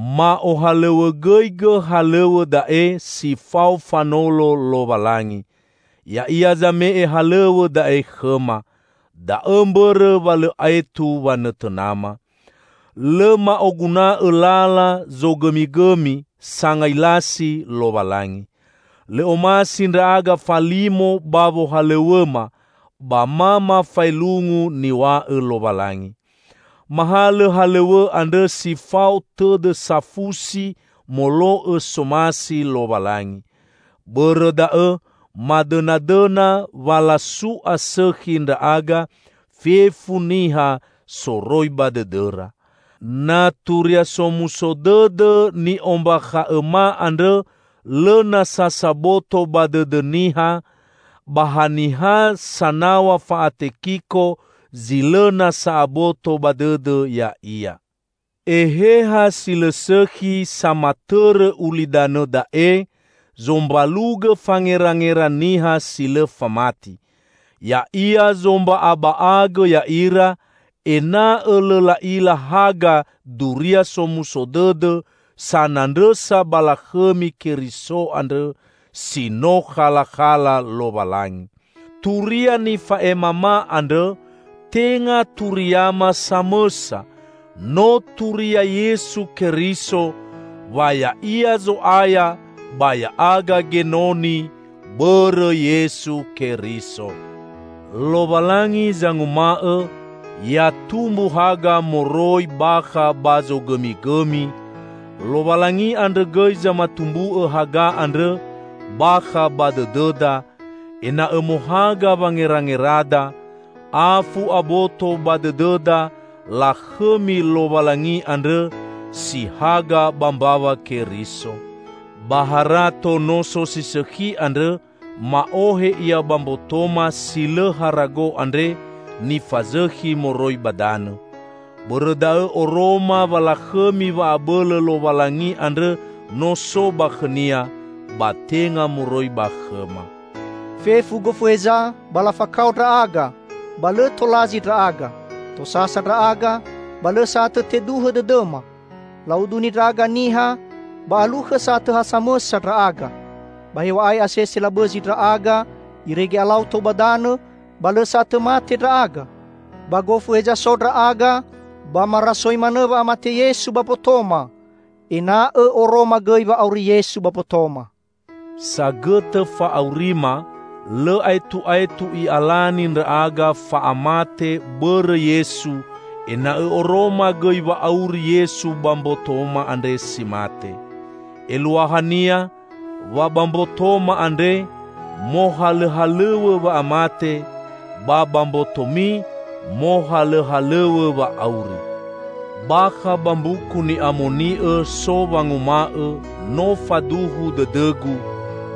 Ma'ohalõw̃õgõigõ halõw̃õ da'e si fao fanolo Lowalangi. Ya'ia zame'e halõw̃õ da'e khõma. Da'õ mbõrõ wa lõ aetu wanõtõnama. Lõ ma'oguna'õ lala zogõmigõmi sangailasi Lowalangi. Lõ omasi ndra'aga falimo ba wohalõw̃õma, ba ma mafaelungu niw̃a'õ Lowalangi. Mahalõ halõw̃õ andrõ si fao tõdõ safusi molo'õ somasi Lowalangi. Bõrõ da'õ madõnadõna wa lasu'a sõkhi ndra'aga fefu niha soroi ba dõdõra. Na Turia Somuso Dõdõ ni'ombakha'õma andrõ lõ nasa saboto ba dõdõ niha, ba ha niha sanaw̃a fa'atekiko zi lõ nasa aboto ba dõdõ ya'ia. Eheha si lõ sõkhi samatõrõ ulidanõ da'e zombalugõ fangerangera niha si lõ famati. Ya'ia zomba'aba'agõ ya'ira ena'õ lõ la'ila haga Duria Somuso Dõdõ sanandrõsa ba lakhõmi Keriso andrõ; si no khalakhala Lowalangi. Turia nifa'emama andrõ tenga turiama samõsa, no turia Yesu Keriso; wa Ya'ia Zo'aya ba ya'aga genoni bõrõ Yesu Keriso; Lowalangi zanguma'õ, "Ya tumbu haga moroi bakha ba zogõmigõmi," Lowalangi andrõ gõi zamatumbu'õ haga andrõ bakha ba dõdõda, ena'õ mohaga wangerangerada, afu aboto ba dõdõda lakhõmi Lowalangi andrõ si haga ba mbawa Keriso. Ba harato noso si sõkhi andrõ ma'ohe ia ba mbotoma si lõ harago andre nifazõkhi moroi ba danõ. Bõrõ da'õ oroma wa lakhõmi wa'abõlõ Lowalangi andrõ no so ba khõ-Nia, ba tenga moroi ba khõma. Fefu gofu heza ba lafakao ndra'aga, ba lõ tolazi ndra'aga, tosasa ndra'aga, ba lõ sa'atõ teduhõ dõdõma. La'uduni ndra'aga niha ba alukhõ sa'atõ ha samõsa ndra'aga. Ba hew̃a'ae asese labõzi ndra'aga irege alau tou ba danõ, ba lõ sa'atõ mate ndra'aga. Ba gofu heza so ndra'aga ba marasoi manõ wa'amate Yesu ba mbotoma, ena'õ oroma gõi wa auri Yesu ba mbotoma. Sagõtõ fa'aurima, lõ aetu'aetu i'alani ndra'aga fa'amate bõrõ Yesu, ena'õ oroma gõi wa'auri Yesu ba mbotoma andre si mate. Eluahania wa ba mbotoma andre mohalõhalõw̃õ wa'amate, ba ba mbotomi mohalõhalõw̃õ wa'auri. Bakha ba Mbuku Ni'amoni'õ so wanguma'õ, "No faduhu dõdõgu,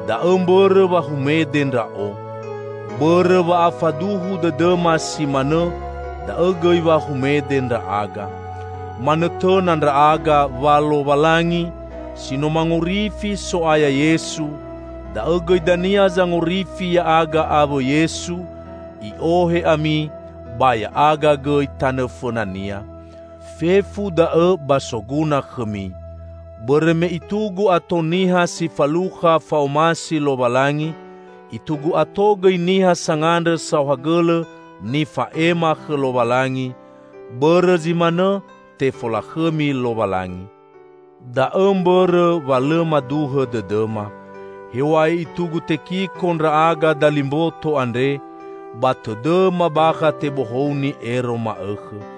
da'õ mbõrõ wa humede ndra'o." Bõrõ wa'afaduhu dõdõma si manõ da'õ gõi wa humede ndra'aga. Manõtõna ndra'aga wa Lowalangi, si no mangorifi So'aya Yesu, da'õ gõi dania zangorifi ya'aga awõ Yesu, I'ohe ami ba ya'aga gõi tanõ fõna-Nia. Fefu da'õ ba soguna khõmi. Bõrõ me itugu ato niha si falukha fa'omasi Lowalangi, itugu ato gõi niha sangandrõ saohagõlõ nifa'ema khõ Lowalangi; bõrõ zi manõ tefolakhõmi Lowalangi. Da'õ mbõrõ wa lõ maduhõ dõdõma. Hew̃a'ae itugu tekiko ndra'aga dali mboto andre, ba tõdõma bakha tebohouni ero ma'õkhõ.